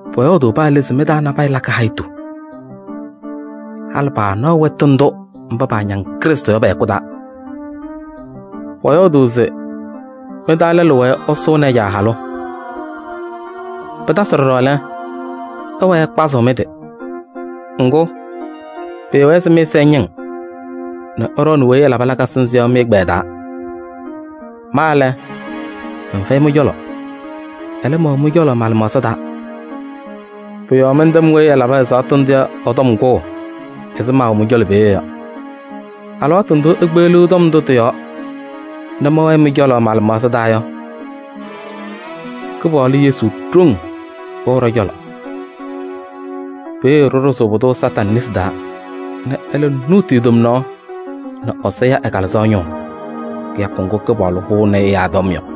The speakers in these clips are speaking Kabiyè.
Pɔyɔɔdʋʋ paa le se mɩ-taa nabɛyɛ lakɩ hayitu. Halɩ paanaɣ wɛtʋ ndʋ mba paañaŋ Krɩstʋ yɔ pɛ-hɛkʋ taa. Pɔyɔɔdʋʋ se mɩ-taa lɛlʋ wɛɛ ɛsʋʋnɩ ɛ-caa halʋ. Pɩtasɩ ɖɔɖɔ lɛ, ɩwɛɛ ɩkpazɩɣ mɩ-tɩ. Ŋgʋ, pɩɩwɛɛ se mɩ-ɛza ɛñɩŋ nɛ ɩɖɔɔnɩ weyi ɛlabɩ lakasɩ nzɩ yɔ mɩ-ɛgbɛyɛ taa. Ma lɛ, mɛnfɛyɩ mɩ-cɔlɔ, ɛlɛ, mɛwɛ mɩ-cɔlɔ ma-lɩmaɣza taa. Pʋ-yɔɔ mɛntɛm weyi ɛlabɩ ɛzaɣtʋ ndʋ yɔ ɛ-tɔm kʋʋ ɛzɩ maawɛɛ mɩ-cɔlɔ peeye yɔ. Alɩwaatʋ ndʋ ikpeɣliɣ tɔm ndʋ tɩ-yɔɔ nɛ mɛwɛ mɩ-cɔlɔ ma-lɩmaɣza taa yɔ, Kɩpaɣlʋ Yesu ɖoŋ wɛɣ ɖɔ-cɔlɔ. Peeye ɖɩɖʋzʋʋ pʋdʋ Satanɩ nesi taa nɛ ɛlɛ nuuti e-tomnaɣ nɛ Ɛsɔ ya ɛ-Kalɩzaɣ ñʋʋ kɩyakʋ ŋgʋ Kɩpaɣlʋ hʋʋnɩ ɛyaa tɔm yɔ.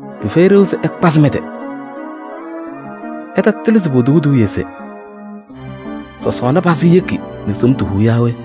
Pɩfɛyɩ ɖeu se ɩkpazɩ mɩ-tɩ. Ɩtatɩlɩ se potuu eduuye se: “Sɔsɔɔna pazɩ yekina nɛ somtu huu yaa we?”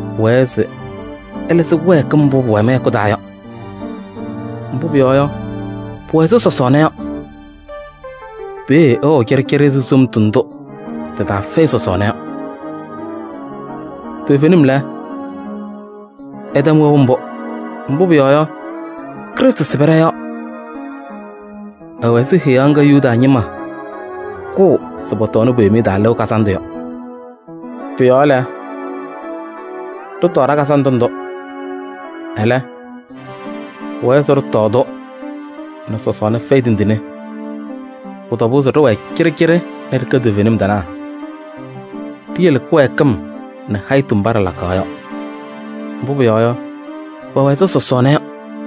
Pʋwɛɛ se ɩlɩzɩ kɩwɛɛkɩm mbʋ pʋwɛ mɩ-hɛkʋ taa yɔ, mbʋ pʋyɔɔ yɔ, pʋwɛ ɛzɩ sɔsɔɔna yɔ. Peeye ɩwɛɣ cɩɖɩcɩɖɩ ɛzɩ somtu ndʋ tɩ-taa fɛyɩ sɔsɔɔna yɔ. Toovenim lɛ, ɩtɛm wɛʋ mbʋ. Mbʋ pʋyɔɔ yɔ, Krɩstʋ sɩbɩ ɖɔ-yɔɔ. Ɛwɛ ɛzɩ heɣa ŋga Yuda ñɩma kʋʋ se pɔtɔɔnɩ po-Yomiye Taa Lɩʋ Kazandʋ. Pʋ-yɔɔ lɛ, ɖɩtɔɔ ɖa-kazandʋ ndʋ. Ɛlɛ, pʋwɛɛ se ɖɩtɔɔ-tʋ nɛ sɔsɔɔna fɛyɩ tindine. Pʋ-tɔbʋʋ se ɖɩwɛɛ cɩɖɩcɩɖɩ nɛ ɖɩkɛ toovenim tɩnaa. Ɖiyele kɩwɛɛkɩm nɛ hayitu mba ɖɩlakaɣ yɔ, mbʋ pʋyɔɔ yɔ, pɛwɛ ɛzɩ sɔsɔɔna yɔ.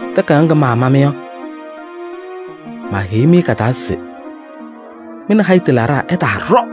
Takayaɣ ŋga maama-mɩ yɔ, maaheyi-mɩ ka-taa se mɩ nɛ hayitu laɖaa ɩtaaɖɔ.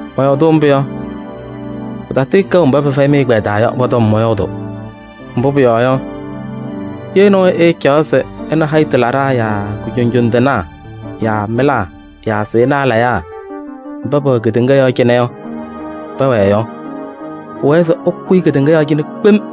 Mɔyɔɔdʋʋ mbʋ yɔ, pɩtatɩɩkɛʋ mba pɛfɛyɩ mɩ-ɛgbɛyɛ taa yɔ, pɔ-tɔm mɔyɔɔdʋʋ. Mbʋ pʋyɔɔ yɔ, ye nɔɔyʋ ɛɛcaɣ se ɛ nɛ hayitu laɖaa yaa kujoŋjoŋ tɩnaa yaa mɩlaa yaa sɩɩnaa layaa mba pɛwɛ kedeŋa yɔɔ cɩnɛ yɔ pɛwɛɛ yɔ, pʋwɛɛ se ɛkʋyɩ kedeŋa yɔɔ cɩnɛ kpem.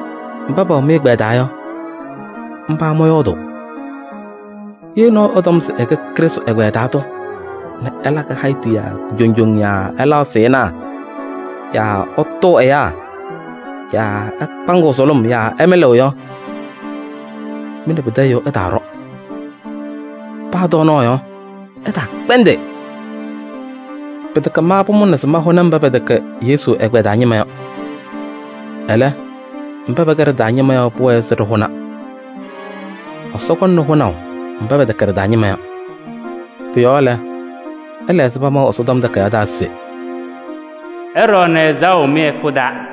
Mba pɛwɛ mɩ-ɛgbɛyɛ taa yɔ, mba mɔyɔɔdʋʋ. Ye nɔɔyʋ ɛtɔm se ɛkɛ Krɩstʋ ɛgbɛyɛ taa tʋ nɛ ɛlakɩ hayitu yaa kujoŋjoŋ yaa ɛlaɣ sɩɩnaa yaa ɛtʋʋ ɛyaa yaa ɛkpaŋɩɣ sʋlʋm yaa ɛmɩlɩɣ yɔ, mɩ nɛ pɩtɛ ɛyʋ ɩtaaɖɔ, paa tɔɔnaɣ yɔ, ɩtaakpɛndɩ. Pɩtɛkɛ ma pʋmʋnaa se mahʋnɩ mba pɛtɛkɛ Yesu ɛgbɛyɛ taa ñɩma yɔ. Ɛlɛ, mba pɛkɛ ɖɩ-taa ñɩma yɔ pʋwɛɛ se ɖɩhʋna. Ɛsɔ kɔŋna hʋnaʋ mba pɛtɛkɛ ɖɩ-taa ñɩma yɔ. Pʋ-yɔɔ lɛ, ɩla ɛzɩ pamaʋ Ɛsɔtɔm Takayaɣ taa se: “Ɩɖɔɔnɩ ɛzaɣʋ mɩ-hɛkʋ taa yɔ.”